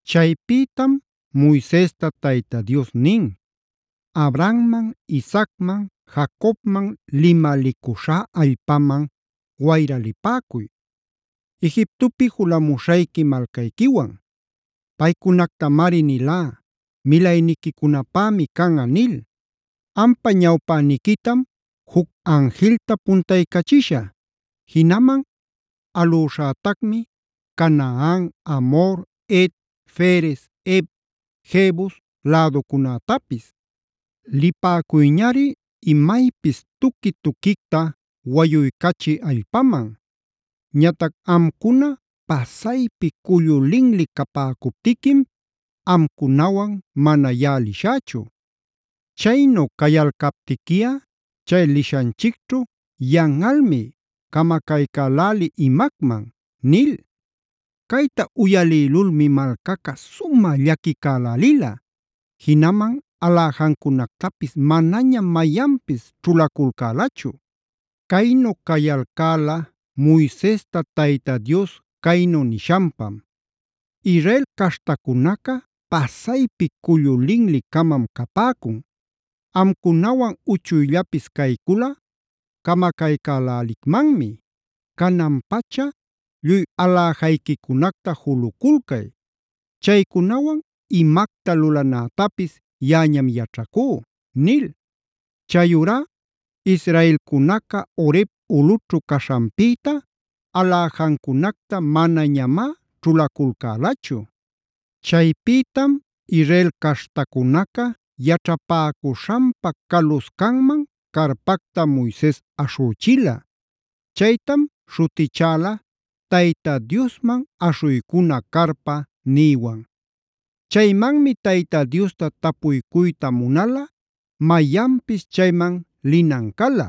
Chaypïtam Moisesta Tayta Dios nin: “Abrahamman,a Isaacman,b Jacobmanc limalicuśhá allpaman wayra lipäcuy Egiptopi julamuśhayqui malcayquiwan. Paycunactamari nilá ‘milayniquicunapämi canꞌa’ nil. Ampa ñawpäniquitam juc anjilta puntaycachishä. Jinaman alüśhätacmi Canaan, Amhor, Het, Ferez, Hev, Jebus läducunätapis. Lipäcuyñari imaypis tuqui-tuquicta wayuycachï allpaman. Ñatac amcuna pasaypi cullu linli capäcuptiquim amcunawan mana yaꞌa lishächu. Chaynu cayalcaptiquiꞌa chay lishanchicćhu yanꞌalmi camacaycälälï imacman” nil. Cayta uyalïlulmi malcaca sumä llaquicälälila. Jinaman aläjancunactapis manañam mayanpis ćhulaculcälachu. Caynu cayalcäla Moisesta Tayta Dios caynu nishanpam: “Israel caśhtacunaca pasaypi cullu linli-camam capäcun. Amcunawan uchuyllapis cayculꞌa camacaycälälicmanmi. Canan-pacha lluy aläjayquicunacta juluculcay. Chaycunawan imacta lulanätapis yaꞌañam yaćhacú” nil. Chayurá israelcunaca Horebd ulꞌućhu caśhanpïta aläjancunacta manañamá ćhulaculcälachu. Chaypïtam Israel caśhtacunaca yaćhapäcuśhanpa caluscanman carpacta Moises aśhüchila. Chaytam śhutichäla “Tayta Diosman aśhuycuna carpa” nïwan. Chaymanmi Tayta Diosta tapuycuyta munalꞌa mayanpis chayman linan cala.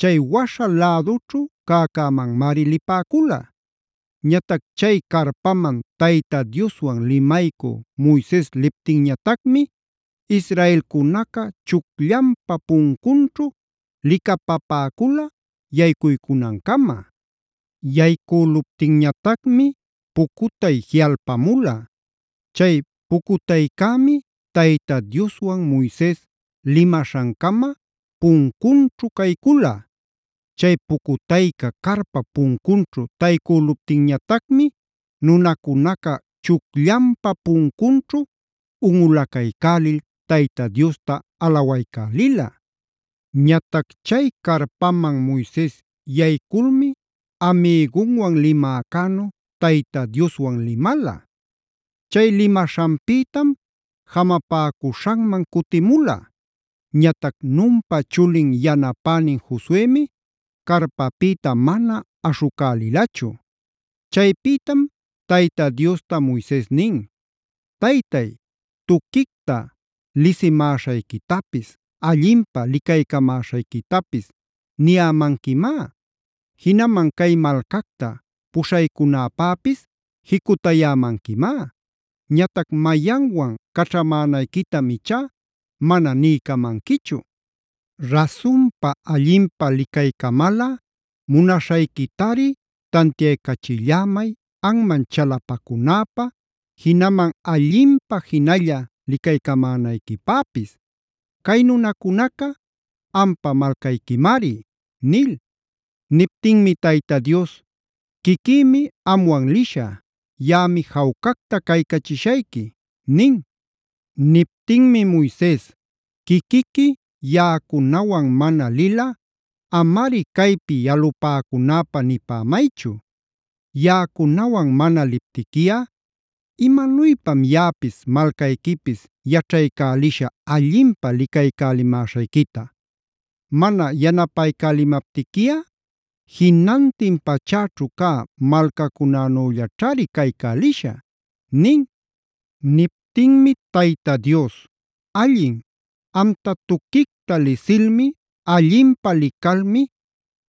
Chay waśha lädućhu cäcämanmari lipäcula. Ñatac chay carpaman Tayta Dioswan limaycü Moises liptinñatacmi israelcunaca chucllanpa puncunćhu licapapäcula yaycuycunancama. Yaycüluptinñatacmi pucutay jiꞌalpamula. Chay pucutaycämi Tayta Dioswan Moises limaśhancama puncunćhu caycula. Chay pucutayca carpap puncunćhu taycüluptinñatacmi nunacunaca chucllanpa puncunćhu unꞌulacaycälil Tayta Diosta alawaycälila. Ñatac chay carpaman Moises yayculmi amïgunwan limäcänu Tayta Dioswan limala. Chay limaśhanpïtam jamapäcuśhanman cutimula. Ñatac Nunpa chulin yanapänin Josuemi carpapïta mana aśhucälilachu. Chaypïtam Tayta Diosta Moises nin: “Taytay, tuquicta lisimäśhayquitapis, allinpä licaycamäśhayquitapis niyämanquimá. Jinaman cay malcacta puśhaycunäpäpis jicutayämanquimá. Ñatac mayanwan caćhamänayquitam ichá mana niycamanquichu. Rasunpa allinpä licaycamalꞌa munaśhayquitari tantiaycachillämay anman chalapacunäpä, jinaman allinpä jinalla licaycamänayquipäpis. Cay nunacunaca ampa malcayquimari” nil. Niptinmi Tayta Dios: “Quiquïmi amwan lishä. Yaꞌami jawcacta caycachishayqui” nin. Niptinmi Moises: “Quiquiqui yaꞌacunawan mana lilꞌa amari caypi yalupäcunäpä nipämaychu. Yaꞌacunawan mana liptiquiꞌa ¿imanuypam yaꞌapis malcayquipis yaćhaycälishä allinpä licaycälimäśhayquita? Mana yanapaycälimaptiquiꞌa jinantin pachäćhu cä malcacunänüllaćhari caycälishä” nin. Niptinmi Tayta Dios: “Allin, amta tuquicta lisilmi, allinpä licalmi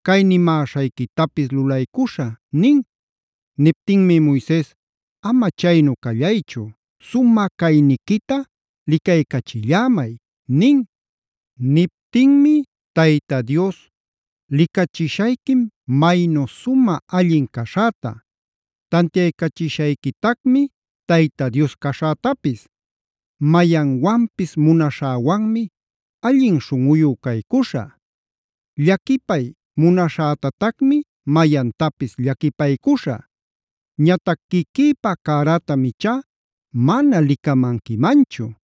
cay nimäśhayquitapis lulaycuśhä” nin. Niptinmi Moises: “Ama chaynu callaychu, sumä cayniquita licaycachillämay” nin. Niptinmi Tayta Dios: “Licachishayquim maynu sumä allin caśhäta. Tantiaycachishayquitacmi Tayta Dios caśhätapis. Mayanwanpis munaśhäwanmi allin śhunꞌuyu caycuśhä. Llaquipay munaśhätatacmi mayantapis llaquipaycuśhä. Ñatac quiquïpa cärätam ichá mana licamanquimanchu.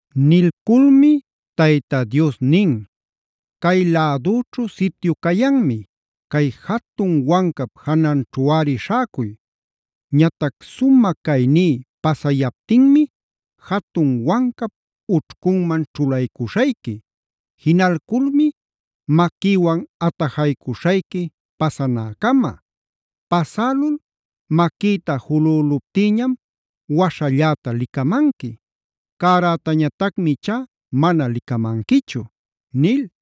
Nilculmi Tayta Dios nin: “Cay lädüćhu sityu cayanmi. Cay jatun wancap jananćhuꞌari śhäcuy. Ñatac sumä cayní pasayaptinmi jatun wancap ućhcunman ćhulaycuśhayqui. Jinalculmi maquïwan atajaycuśhayqui pasanäcama. Pasälul maquïta julüluptïñam waśhalläta licamanqui. Cärätañatacmi ichá mana licamanquichu” nil.